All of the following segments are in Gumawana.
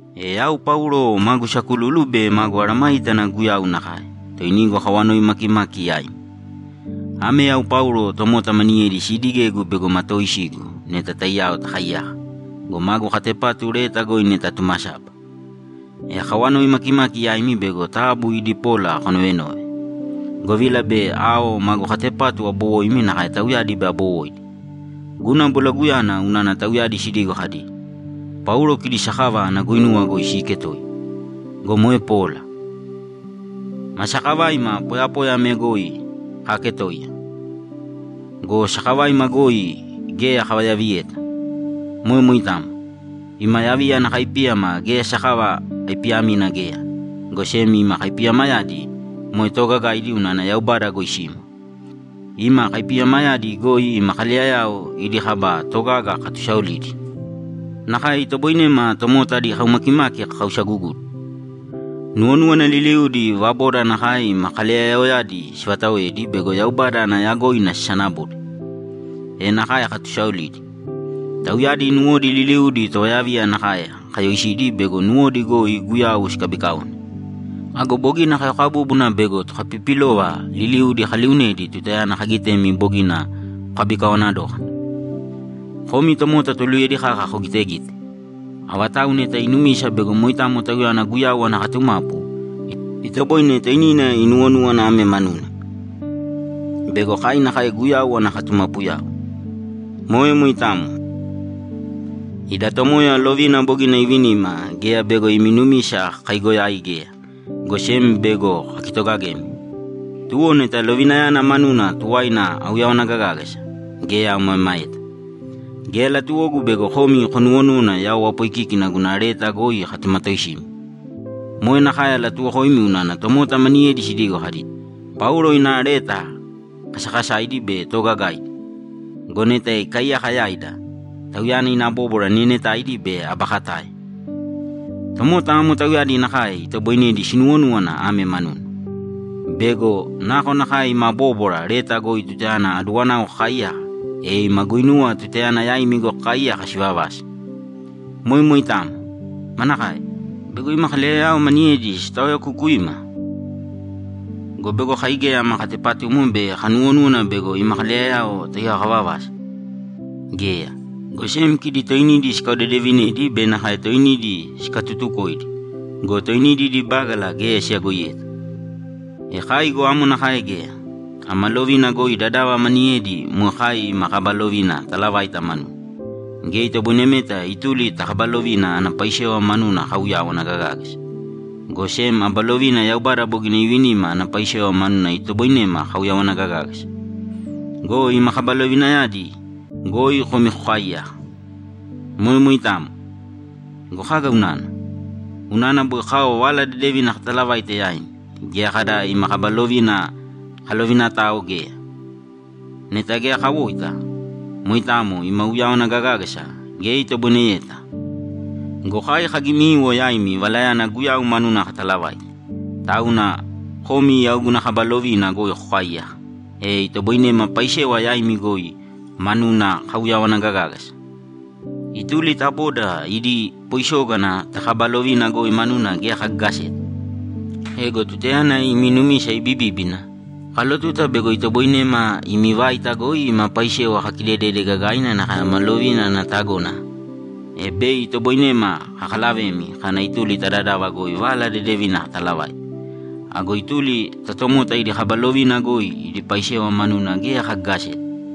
E yau Paulo magu sakululu be magu mesayágana Guyau nakae, toinigu akawanoi makimaki yaimi. Ame yau Paulo tomota maniyedi siidigegu bego matooisigu neta taiyao takaiyaka go, magu katepatu leta goi neta atumasaba. E akawanoi makimaki yaimi bego taabu idi pola konovenōve, govila bei ao magu katepatu abowoimi nakae tauyadi bei abowoidi. Guna bolaguyana unana tauyadi sidigo kadi, ‘Paulo kidi sakava ana guinuwa goi siiketoiya.’ Go moe pola. Ma saakavaima poyapoya ame goi kaaketoiya go, sakavaima goi geya kavayaviyeta. Moe moitamo. Ima yaviya ana kaipíyama geya sakava aipiyamina geya, go sem ima kaipiyamayadi moe toogagaidi unana Yaubada goi sima. Ima kaipiyamayadi goi ima kaleyayao idi kaba togaga katusaolidi. Nakae itoboinema tomota idi kaumakimaki kakausagugudi. Nuwonúwana liliudi vaboda nakae ima kaleyayaoyadi sivataoedi bego Yaubada ana yagoina sisaanabode, e nakae katusaolidi. Tauyadi nuwodi liliudi tovayaviya nakae kayoisidi bego nuwodi goi Guyau sikabikaone. Ago bogina kayokabúbuna bego tokapipilova liliudi kaliunedi tutayana kagitemi bogina kokabikawana dókana. Komi tomota toluyedi kaka kogitegite! Avatau neta inumisa bego moitamo tauyana Guyau ana katumapu, itoboine toinina inuwonúwana ame manuna: Bego kai nakae Guyau ana katumapuyao. Moe moitamo. Ida Tomoya lovina bogina ivinima geya bego imi numisa kakaigoyai geya, go sem bego kakitogagemi. Tuwo neta lovinayana manuna tuwaina auyawana gagágasa, geya aomaemaeta. Geya latuwogu bego komi konuwonúwana yau apoikíkina guna leta goi akatumatoisimi. Moe nakae alatuwokoimi unana tomota maniyedi sidigo kadi, ‘Paulo ina leta kasakasaidi be toogagaidi go, neta ikaaiyaka yaida, tauyana ina bóbwara neenetaidi be aba katae.’ Tomota amo tauyadi nakae itoboinedi sinuwonúwana ame manuna: Bego nakonakae ima bóbwara leta goi tutayana aduwanau kakaaiyaka, e ima guinuwa tutayana yaimi goi kakaaiyaka sivavasa. Moe moitamo. Manakae? Bego ima kaleyayao maniyedi sitaoyakukuima? Go bego kai geya ama katepatumo be kanuwonúwana bego ima kaleyayao taiyao kavavasa? Geya, go sem kidi toinidi sikaodedevinedi be nakae toinidi sikatutukoidi go, toinidi idi bágala geya siyagoiyeta. E kai go amo nakae geya. Ama lovina goi dadava maniyedi moe kai ima kaba lovina talavaita manuna. Geya itoboinemeta ituli ta kaba lovina ana paisewa manuna kauyawana gagágasa, go sem aba lovina Yaubada bogina ivinima ana paisewa manuna itoboinema kauyawana gagágasa. Go ima kaba lovinayadi goi komi kokaaiyaka. Moe moitamo. Go kaga unana? Unana boi kao Vala Dedevina katalavaite yaimi, geya kada ima kaba lovina kalovinatao geya. Neta geya kawoita, moitamo ima uyawana gagágasa geya itoboineyeta go, kai kagimiiwo yaimi Valayana Guyau manuna katalavaite. Tauna komi yau guna kaba lovina goi kokaaiyaka, e itoboinema paisewa yaimi goi manuna kauyawana gagágasa. Ituli ta boda idi poisógana ta kaba lovina goi manuna geya kagagaseta. Ego tutayana imi numisa ibibíbina, kalotuta bego itoboinema imi vaita goi ima paisewa kakidedede gagaina nakae ama lovina ana tagona, e bei itoboinema kakalavemi kana ituli ta dadava goi Vala Dedevina katalavaite. Ago ituli ta tomota idi kaba lovina goi idi paisewa manuna geya kagagaseta.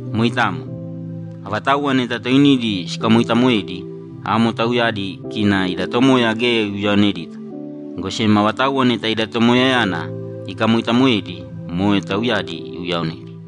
Moitamo. Avatauwa neta toinidi sikamoitamoedi, amo tauyadi kina ida Tomoya geya iuyaonedita, go sem avatauwa neta ida Tomoyayana ikamoitamoedi, moe tauyadi iuyaonedi.